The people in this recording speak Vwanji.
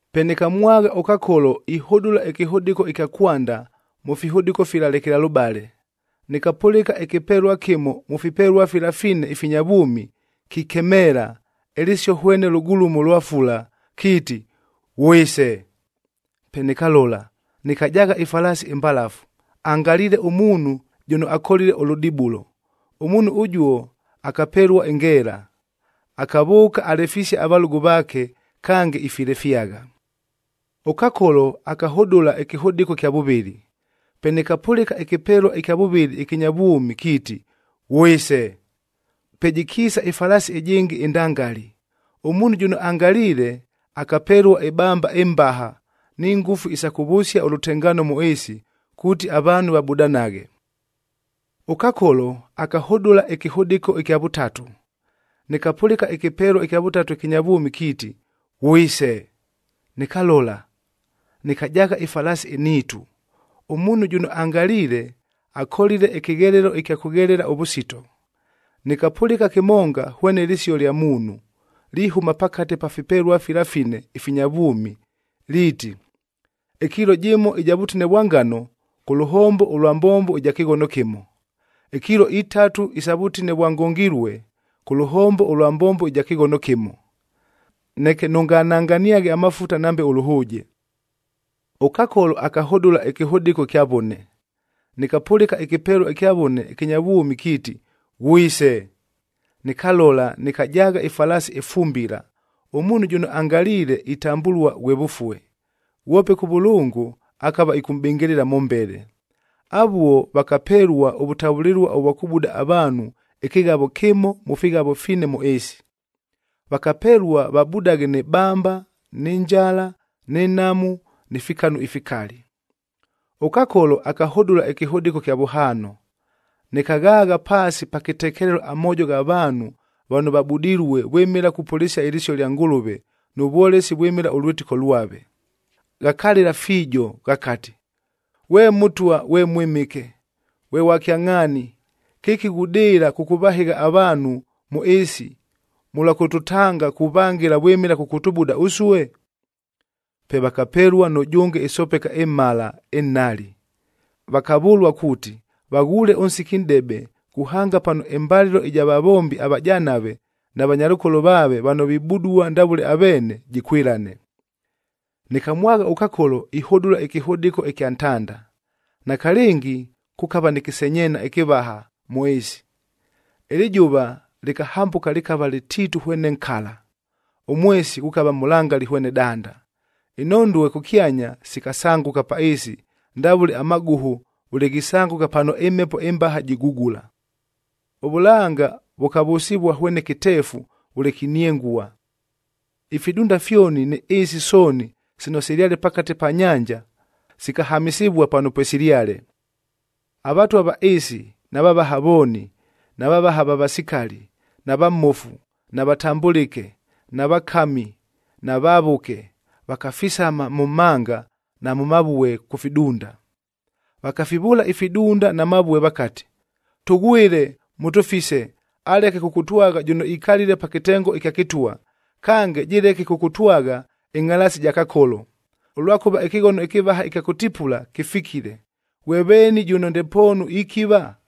Pe nɨkamwagha ʉKakolo ihʉdʉla ɨkɨhʉdɨko ɨkya kwanda mʉ fihʉdɨko fila lekelalʉbale. Nɨkapʉlɨka ɨkɨpelua kɨmo mʉ fipelua fila fine ifinya vwʉmi kikemeela, ɨlɨsio hwene lʉgulumo lwa fula kiiti, “Ghwise!” Pe nɨkalola, nɨkajaagha ɨfalaasi ɨmbalafu, angaliile ʉmuunhu jʉno akolile ʉlʉdibulo. Ʉmuunhu ʉjuo akapelua ɨngeela, akavʉʉka alefisie avalʉgʉ vaake, kange ifilefyagha. ɄKakolo akahʉdʉla ɨkɨhʉdɨko ɨkya vʉvɨlɨ. Pe nɨkapʉlɨka ɨkɨpelua ɨkya vʉvɨlɨ ɨkɨnya vwʉmi kiiti, “Ghwise!” Pe jɨkiisa ɨfalaasi ɨjɨngɨ ɨndangali, ʉmuunhu jʉno angaliile akapelua ɨbamba ɨmbaha ni ngʉfu isa kʉvʉsia ʉlʉtengaano mʉ ɨɨsi kuuti avaanhu vabudanaghe. ɄKakolo akahʉdʉla ɨkɨhʉdɨko ɨkya vʉtatu. Nɨkapʉlɨka ɨkɨpelua ɨkya vʉtatu ɨkɨnya vwʉmi kiiti, “Ghwise!” Nɨkalola, nɨkajaagha ɨfalaasi ɨnhiitu, ʉmuunhu jʉno angaliile, akolile ɨkɨghelelo ɨkya kʉghelela ʉvʉsito. Nɨkapʉlɨka kɨmonga hwene lɨsio lya muunhu, lihʉma pakate pa fipelua fila fine ifinya vwʉmi, liiti, “Ɨkiilo jɨmo ɨja vʉtine vwa ngano, kʉ lʉhombo ʉlwa mbombo ɨja kɨghono kɨmo; ikiilo itatu isa vʉtine ʉvwa ngongilue, kʉ lʉhombo ʉlwa mbombo ɨja kɨghono kɨmo. Neke nʉngananganiaghe amafuta nambe ʉlʉhʉʉje.” ɄKakolo akahʉdʉla ɨkɨhʉdɨko ɨkya vʉne. Nɨkapʉlɨka ɨkɨpelua ɨkya vʉne ɨkɨnya vwʉmi kiiti, “Ghwise!” Nɨkalola nɨkajaagha ɨfalaasi ɨfumbila, ʉmuunhu jʉno angaliile itambʉlua ghwe Vʉfue, ghwope Kʉvʉlʉngʉ akava ɨkʉmʼbɨngɨlɨla mʉmbele. Avuo vakapelua ʉvʉtavʉlɨlua ʉvwa kʉbuda avaanhu ɨkɨghavo kɨmo mʉ fighavo fine mʉ ɨɨsi. Vakapelua vabudaghe nɨ bamba, nɨ njala, nɨ nhamu, ni fikanu ifikali. ɄKakolo akahʉdʉla ɨkɨhʉdɨko ɨkya vʉhaano. Nɨkaghaagha paasi pa kɨtekelelo amoojo gha vaanhu vano vabudilue vwɨmɨla kupʉlɨsia ɨlɨsio lya Ngʉlʉve nʉ vwolesi vwɨmɨla ʉlwɨtɨko lwave. Ghakalɨla fiijo ghakati, “Ghwe Mʉtwa ghwe Mwɨmɨke, ghwe ghwa kyangʼhaani, kɨki ghudɨɨla kʉkʉvahɨgha avaanhu mʉ ɨɨsi mʉlwa kʉtʉtanga kuvangɨla vwɨmɨla kʉkʉtʉbuda ʉsue?” Pe vakapelua nʉjʉnge ɨsopeka ɨmhala ɨnhali, vakavʉlua kuuti, vaghuule ʉnsiki nʼdebe kuhanga pano ɨmbalɨlo ɨja vavombi avajanave na vanyalʉkolo vaave vano vibudua ndavʉle aveene, jɨkwɨlane. Nɨkamwagha ʉKakolo ihʉdʉla ɨkɨhʉdɨko ɨkya ntanda. Nakalɨngi kʉkava nɨ kɨsenyeena ɨkɨvaha mʉ ɨɨsi. Ɨlɨjʉva lɨkahambʉka lɨkava lɨtiitu hwene nkala. Ʉmwesi ghʉkava mʉlangali hwene danda. Inhondue kʉkyanya sikasangʉka pa ɨɨsi ndavʉle amagʉhʉ vʉle ghisangʉka pano ɨmhepo ɨmbaha jigugula. Ʉvʉlanga vʉkavʉsɨvua hwene kɨteefu vʉle kiniengua. Ifidunda fyoni ni ɨɨsi sooni sino silyale pakate pa nyanja sikahamɨsɨvua pano pwesilyale. Avatwa va ɨɨsi, na vavaha vooni, na vavaha va vasikali, na vamofu, na vatambʉlɨke, na vakami na vavʉke vakafisama mʉ mhanga na mʉ mavue kʉ fidunda. Vakafivʉʉla ifidunda na mavue vakati, “Tʉghwɨle, mʉtʉfise aleke kʉkʉtwagha jʉno ikalile pa kɨtengo ɨkya kɨtwa. Kange, jɨleke kʉkʉtwagha ɨngʼhalaasi ja Kakolo, ʉlwakʉva ɨkɨghono ɨkɨvaha ɨkya kʉtipula, kɨfikile. Ghwe veeni jʉno ndepoonu ikiva?”